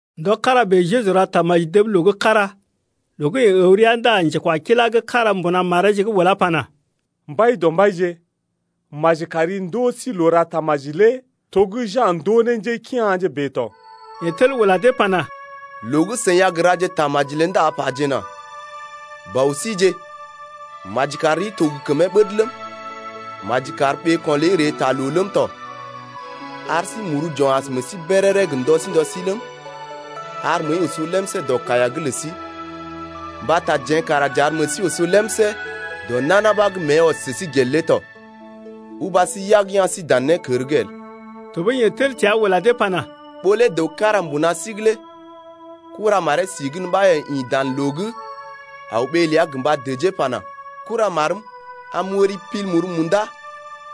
Ndɔ kára bèe Jeju ra tamaji dəb loo gə́ kára. Loo gə́ yeḛ əw rəa ndá njekwakilá gə́ kára mbuna mareeje’g ulá pana: Mbaidɔmbaije, maji kari ndoo sí loo ra tamaji lé to gə́ Ja̰ ndoo ne njékea̰je bèe tɔ. Yeḛ tel ula dee pana: Loo gə́ seḭ a gə raje tamaji lé ndá pajena: Bɔ síje, maji kar rii to gə kəmee ɓəd ləm, Maji kar ɓeeko̰ ləi ree taa loo ləm tɔ. Ar sí muru j’o̰ as meḛ sí béréré gə ndɔ sí ndɔ sí ləm, Ar məəi oso lemsé dɔ kaiya’g lə sí Mbata jeḛ kara j’ar meḛ sí oso lemsé dɔ nana ɓa gə́ mée ɔs sə sí gel lé tɔ, Uba sí yag ya̰ sí dan nékər’g el. Tɔɓəi yeḛ tel təa ula dee pana: Ɓó lé dəw kára mbuna sí’g lé kuramaree si gən ɓa yeḛ ḭ dan loo’g aw ɓee ləa gə mba dəjee pana: Kuramarm, am m’wəri pil muru munda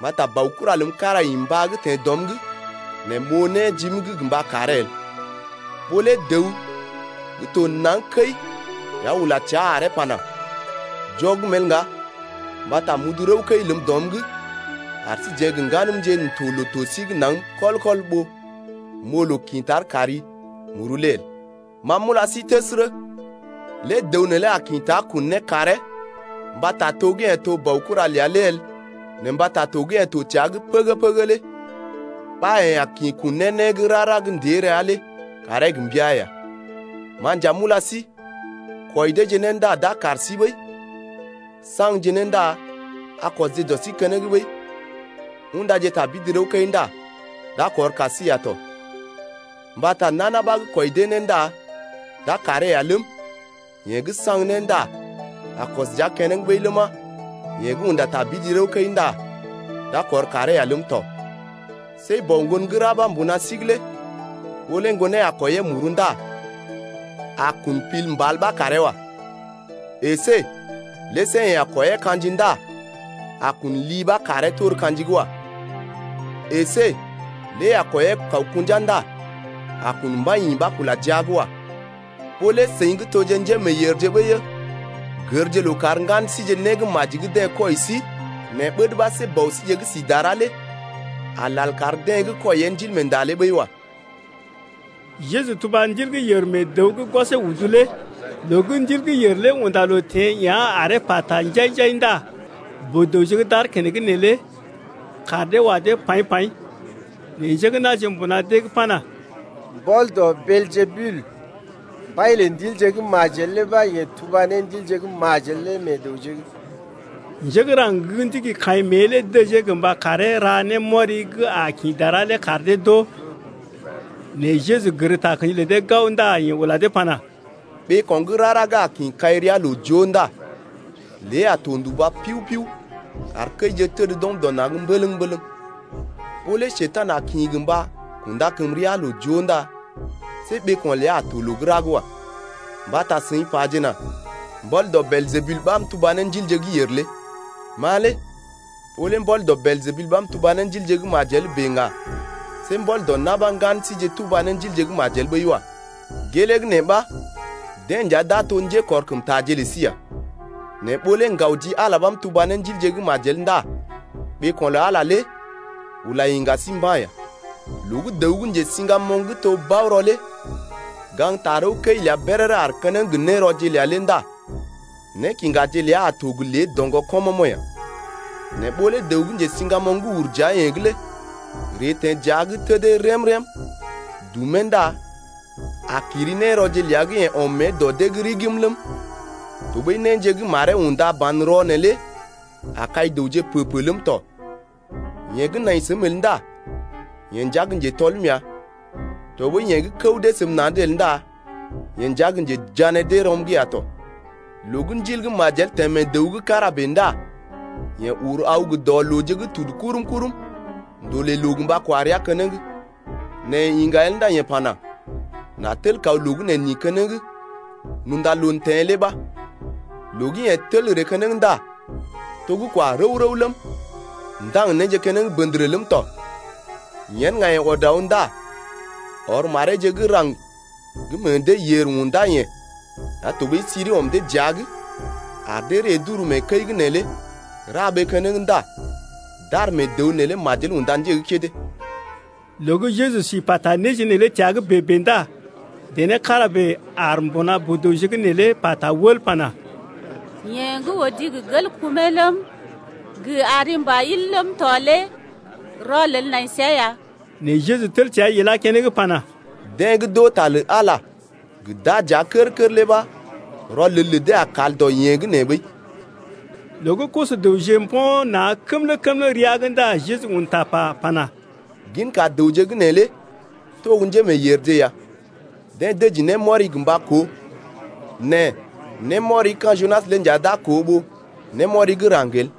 mbata baokura ləm kára ḭ mbá’g teḛ dɔm’g nɛ m’oo né jim’g gə mba karee el. Ɓó lé dəw gə́ to naŋg kəi ya ula təa aree pana: Jɔgm el ŋga mbata m’udu rəw-kəi ləm dɔm’g ar sí jeḛ gə ŋganəmje n’toje loo-to sí’g naŋg kɔl-kɔl ɓó m’oo loo kḭ tar kari muru lé el. Ma m’ula sí təsərə, lé dəw neelé a kḭ ta kun né karee mbata to gə́ yeḛ to ne baokura ləa lé el nɛ mbata to gə́ yeḛ to təa’g pəgə-pəgə lé ɓa yeḛ a kḭ kun ne né gə́ rara gə́ ndée rəa lé karee gə mbəa ya. Ma nja m’ula sí, kwɔi deeje né ndá d’a kar sí ɓəi, saŋgje né ndá a kɔsje dɔ sí keneŋ ɓəi, undaje tabidi rəw-kəi ndá d’a kɔr kar sí ya tɔ. Mbata nana ɓa gə́ kwɔi dee né ndá d’a karee ya ləm, yeḛ gə́ saŋg né ndá a kɔs dəa keneŋ ɓəi ləma, yeḛ gə́ unda tabidi rəw-kəi ndá d’a kɔr karee ya ləm tɔ. See bɔ ŋgon gə́ ra ɓa mbuna sí’g lé ɓó lé ŋgonee a kwɔiyee muru ndá a kun pil mbal ɓa karee wa. Esé see lé yeḛ a kwɔiyee ka̰ji ndá a kun li ɓa karee tor ka̰ji’g wa. Esé lé a kwɔiyee kawkṵja ndá a kun mbai-yḭ ɓa kula jia’g wa. Seḭ gə́ toje njémeeyèrje ɓəi-ə lé gərje loo karje ŋgan síje né gə́ maji gə́ deḛ kwɔi sí nɛ ɓəd ɓa see Bɔ síje gə́ si dara lé a lal kar deḛ gə́ kwɔiyee Ndilmeenda lé ɓəi wa. Jeju tuba ndil gə́ yèr mee dəw gə́ gwɔsee udu lé. Loo gə́ ndil gə́ yèr lé unda loo teḛ yá̰ aree pata njai-njai ndá boo-dəwje gə́ d’aar keneŋ neelé kaar dee wa dee paḭ-paḭ. Nɛ njé gə́ na̰je mbuna dee’g pana: Mbɔl dɔ Beeljebul, mbai lə ndilje gə́ majel lé ɓa yeḛ tuba ne ndilje gə́ majel lé meḛ dəwje’g. Njé gə́ raŋg gə́ ndigi kaḭ mée lé dəjee gə mba karee ra némɔri gə́ a kḭ dara lé kar dee d’oo. Nɛ Jeju gər takə̰ji lə dee gao ndá yeḛ ula dee pana: Ɓeeko̰ gə́ rara gə́ a kḭ kai rəa loo joo ndá lée a to nduba piu-piu kar kəije təd d’ɔm dɔ na̰’d mbələŋ-mbələŋ. Ɓó lé Njekurai a kḭ gə mba kunda kəm rəa loo joo ndá see ɓeeko̰ ləa a to loo gə́ ra’g wa, mbata seḭ pajena: Mbɔl dɔ Beeljebul ɓa m’tuba ne ndilje gə́ yèr lé. Ma lé ɓó lé mbɔl dɔ Beeljebul ɓa m’tuba ne ndilje gə́ majel bèe ŋga see mbɔl dɔ na̰ ɓa ŋgan síje tuba ne ndilje gə́ majel ɓəi wa. Gelee gə́ nee ɓa deḛ nja d’a to gə́ njékɔrkəmtaje lə sí ya. Nɛ ɓó lé ŋgaw ji Ala ɓa m’tuba ne ndilje gə́ majel ndá ɓeeko̰ lə Ala lé ula iŋga sí mba̰ ya. Loo gə́ dəw gə́ njesiŋgamoŋ gə́ to gə́ bao-rɔ lé gaŋg tarəwkəi ləa béréré aar keneŋ gə nérɔje ləa lé ndá nékiŋgaje ləa a to gə lé doŋgɔ kɔmɔmo̰ ya. Nɛ ɓó lé dəw gə́ njesiŋgamoŋ gə́ ur dəa-yeḛ’g lé ree teḛ dəa’g tədee rém-rém dumee ndá a kiri nérɔje ləa gə́ yeḛ ɔm mée dɔ dee’g rigim ləm, tɔɓəi néje gə́ maree unda banrɔ neelé a kai dəwje pə-pə ləm tɔ. Yeḛ gə́ nai səm el ndá yeḛ nja gə́ njetɔlm ya tɔɓəi yeḛ gə́ kəw dee səm dɔ na̰’d el ndá yeḛ nja gə́ njejané dee rɔm’g ya tɔ. Loo gə́ ndil gə́ majel teḛ mee dəw gə́ kára bèe ndá yeḛ uru aw gə dɔ looje gə́ tudu kurum-kurum’g ndolè loo gə́ mba kwa rəa keneŋ. Nɛ yeḛ iŋga el ndá yeḛ pana: N’a tel kaw loo gə́ neḛ n’ḭ keneŋ n’unda loo teḛ lé ɓa. Loo gə́ yeḛ tel ree keneŋ ndá to gə́ kwa rəw-rəw ləm, ndaŋg néje keneŋ bəndərə ləm tɔ. Yen ŋga yeḛ ɔd aw ndá ɔr mareeje gə́ raŋg gə́ meḛ dee yèr undá-yeḛ ya tɔɓəi siri ɔm dee dəa’g ar dee ree d’uru mee kəi’g neelé ra ɓee keneŋ ndá d’ar mee dəw neelé majel unda nje gə́ kédé. Loo gə́ Jeju si pata néje neelé təa’g bèe-bèe ndá dené kára bèe aar mbuna boo-dəwje’g neelé pata wəl pana: Yeḛ gə́ odi gə gel kumee ləm, gə ari mbà il ləm tɔ lé rɔlel nai səa ya! Nɛ Jeju tel ilá keneŋ pana: Deḛ gə́ d’oo ta lə Ala gə́ d’aa dəa kər-kər lé ɓa rɔlel lə dee a kal dɔ yeḛ gə́ nee ɓəi. Loo gə́ koso-dəwje mbo̰ na̰ kəmlə-kəmlə rəa’g ndá Jeju un tapa pana: Ginka dəwje gə́ nee lé to gə́ njémeeyèrje ya, deḛ dəji némɔri gə mba koo nɛ némɔri gə́ ka̰ Junas lé nja d’a koo ɓó némɔri gə́ raŋg el.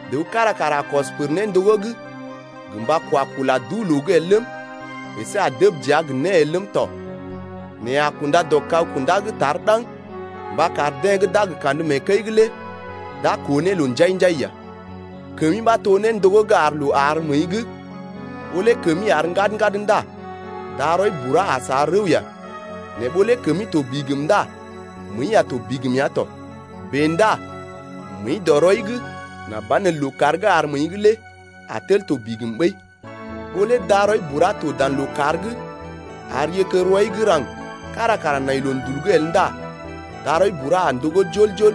Dəw kára kara a kɔs pər néndogó’g gə mba kwa kula duu-loo’g el ləm, əsé a dəb dəa gə né el ləm tɔ, nɛ a kunda dɔ kag-kundá’g tar ɗaŋg mba kar deḛ gə́ d’a gə kandə mee kəi’g lé d’a koo ne loo njai-njai ya. Kəmi ɓa to néndogó gə́ ar loo àr məəi’g. Ɓó lé kəmi àr ŋgad-ŋgad ndá darɔi bura a sa rəw ya. Nɛ ɓó lé kəmi to bigim ndá məəi a to bigim ya tɔ. Bèe ndá məəi dɔ rɔi’g nà banelə lookàr gə́ àr məəi’g lé a tel to bigim ɓəi. Ɓó lé darɔi bura to dan lookàr’g ar yérkér rɔi gə́ raŋg kára kara nai loondul’g el ndá darɔi bura a ndogó jol-jol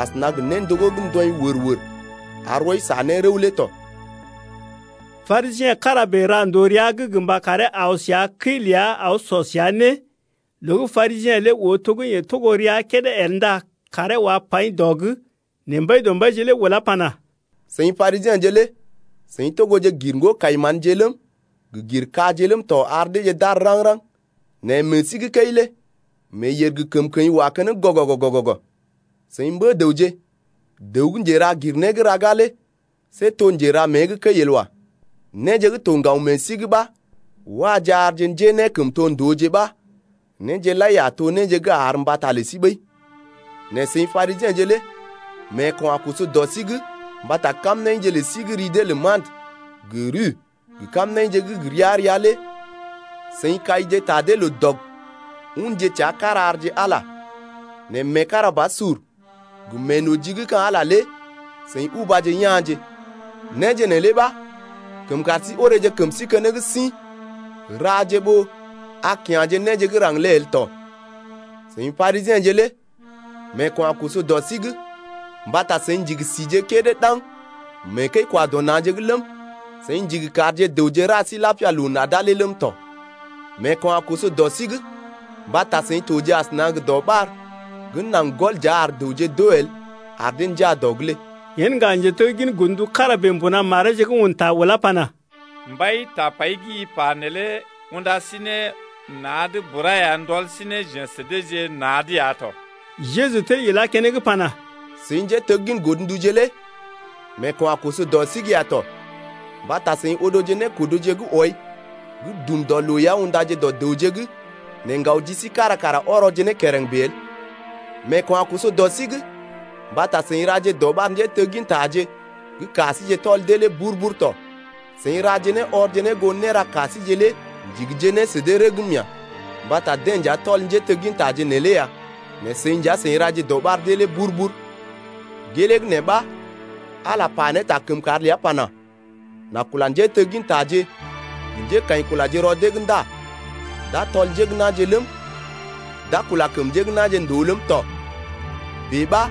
asəna gə néndogó gə́ ndɔḭ wər-wər ar rɔi sa ne rəw lé tɔ. Parisiḛ kára bèe ra ndòo rəa’g gə mba karee aw səa kəi ləa aw sɔ səa né. Loo gə́ Parisiḛ lé oo to gə́ yeḛ togo rəa kédé el ndá kaaree wá paḭ dɔ’g. Nɛ Mbaidɔmbaije lé ulá pana: Seḭ Parisiḛje lé seḭ togoje gir ŋgo-kai-manje ləm gə gir kaje ləm tɔ ar deeje d’àr raŋg-raŋg, nɛ meḛ sí gə́ kəi lé meeyèr gə kəmkəḭ wa keneŋ gɔgɔgɔ-gɔgɔgɔ. Seḭ mbə-dəwje! dəw gə́ njera gir né gə́ raga lé see to njera mée gə́ kəi el wa. Néje gə́ to ŋgaw meḛ sí’g ɓa waje arje njénékəmtondooje ɓa néje lai a to néje gə́ àr mbata lə sí ɓəi tɔ. Nɛ seḭ Parisiḛje lé meeko̰ a koso dɔ sí’g. Mbata seḭ kaije ta kamnaḭje lə sí gə́ ri dee lə mantə gə ruə gə kamnaḭje gə́ gə ria-ria lé loo dɔg ndá unje təa kára-kára arje Ala, nɛ meekarabasur gə meenoji gə́ ka̰ Ala lé seḭ ubaje ya̰je. Néje neelé ɓa kəm kar sí oreeje kəm sí keneŋ sḭ raje ɓó a lal kya̰ ne néje gə́ raŋg lé el tɔ. Seḭ Parisiḛje lé meeko̰ a koso dɔ sí’g. Mbata seḭ ndigi sije kédé ɗaŋg mee kəi-kwa-dɔ-na̰je’g ləm, seḭ ndigi karje dəwje ra sí lapia loo nada lé ləm tɔ. Meeko̰ a koso dɔ sí’g. Mbata seḭ toje asəna gə dɔɓar gə́ naŋg gɔl dəa ar dəwje d’oo el, ar dee njaa dɔ’g lé. Yen ŋga njeteggin godndu kára bèe mbuna mareeje’g un ta ulá pana: Mbai, tapai gə́ i pa neelé unda sí ne na̰’d bura ya ndɔl sí ne jeḛ sə deeje na̰’d ya tɔ. Jeju tel ilá keneŋ pana: Seḭ njéteggin godnduje lé meeko̰ a koso dɔ sí’g ya tɔ. Mbata seḭ odoje nékodoje gə́ wɔi gə́ dum dɔ loo ya undaje dɔ dəwje’g nɛ ŋgaw ji sí kára kara ɔrɔje ne kereŋ bèe el. Meeko̰ a koso dɔ sí’g. Mbata seḭ raje dɔɓar njéteggintaje gə́ ka síje tɔl dee lé bur-bur tɔ. Seḭ raje né ɔrje ne goo néra ka síje lé ndigije ne sə dee rəgm ya. Mbata deḛ nja tɔl njéteggintaje neelé ya nɛ seḭ nja seḭ raje dɔɓar dee lé bur-bur. Gelee gə́ nee ɓa Ala pa ne ta kəmkàr ləa pana: N’a kula njéteggintaje gə njékaḭkulaje rɔ dee’g ndá d’a tɔl njé gə́ na̰je ləm, d’a kula kəm njé gə́ na̰je ndòo ləm tɔ. Bèe ɓa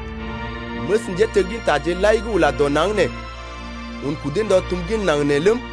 məs njéteggintaje lai gə́ ula dɔ naŋg nee un kudee ndɔ tum gin naŋg nee ləm,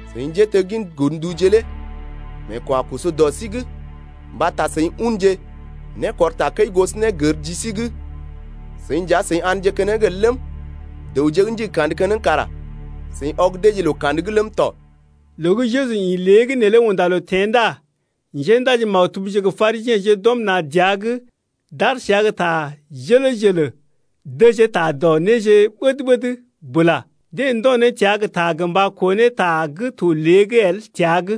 Seḭ njéteggin godnduje lé meeko̰ a koso dɔ sí’g. Mbata seḭ unje nékɔr takəi gosonégər ji sí’g, seḭ nja seḭ a̰dje keneŋ el ləm, dəwje gə́ ndigi kandə keneŋ kara seḭ ɔg deeje loo kandə’g ləm tɔ. Loo gə́ Jeju ḭ lée’g neelé unda loo teḛ ndá njéndaji-maktubje gə Parisiḛje d’ɔm na̰ dəa’g d’aar səa gə tar jələ-jələ dəjee ta dɔ néje gə́ ɓəd-ɓəd bula. Deḛ ndo̰ ne təa gə ta gə mba koo ne ta gə́ to lée’g el təa’g.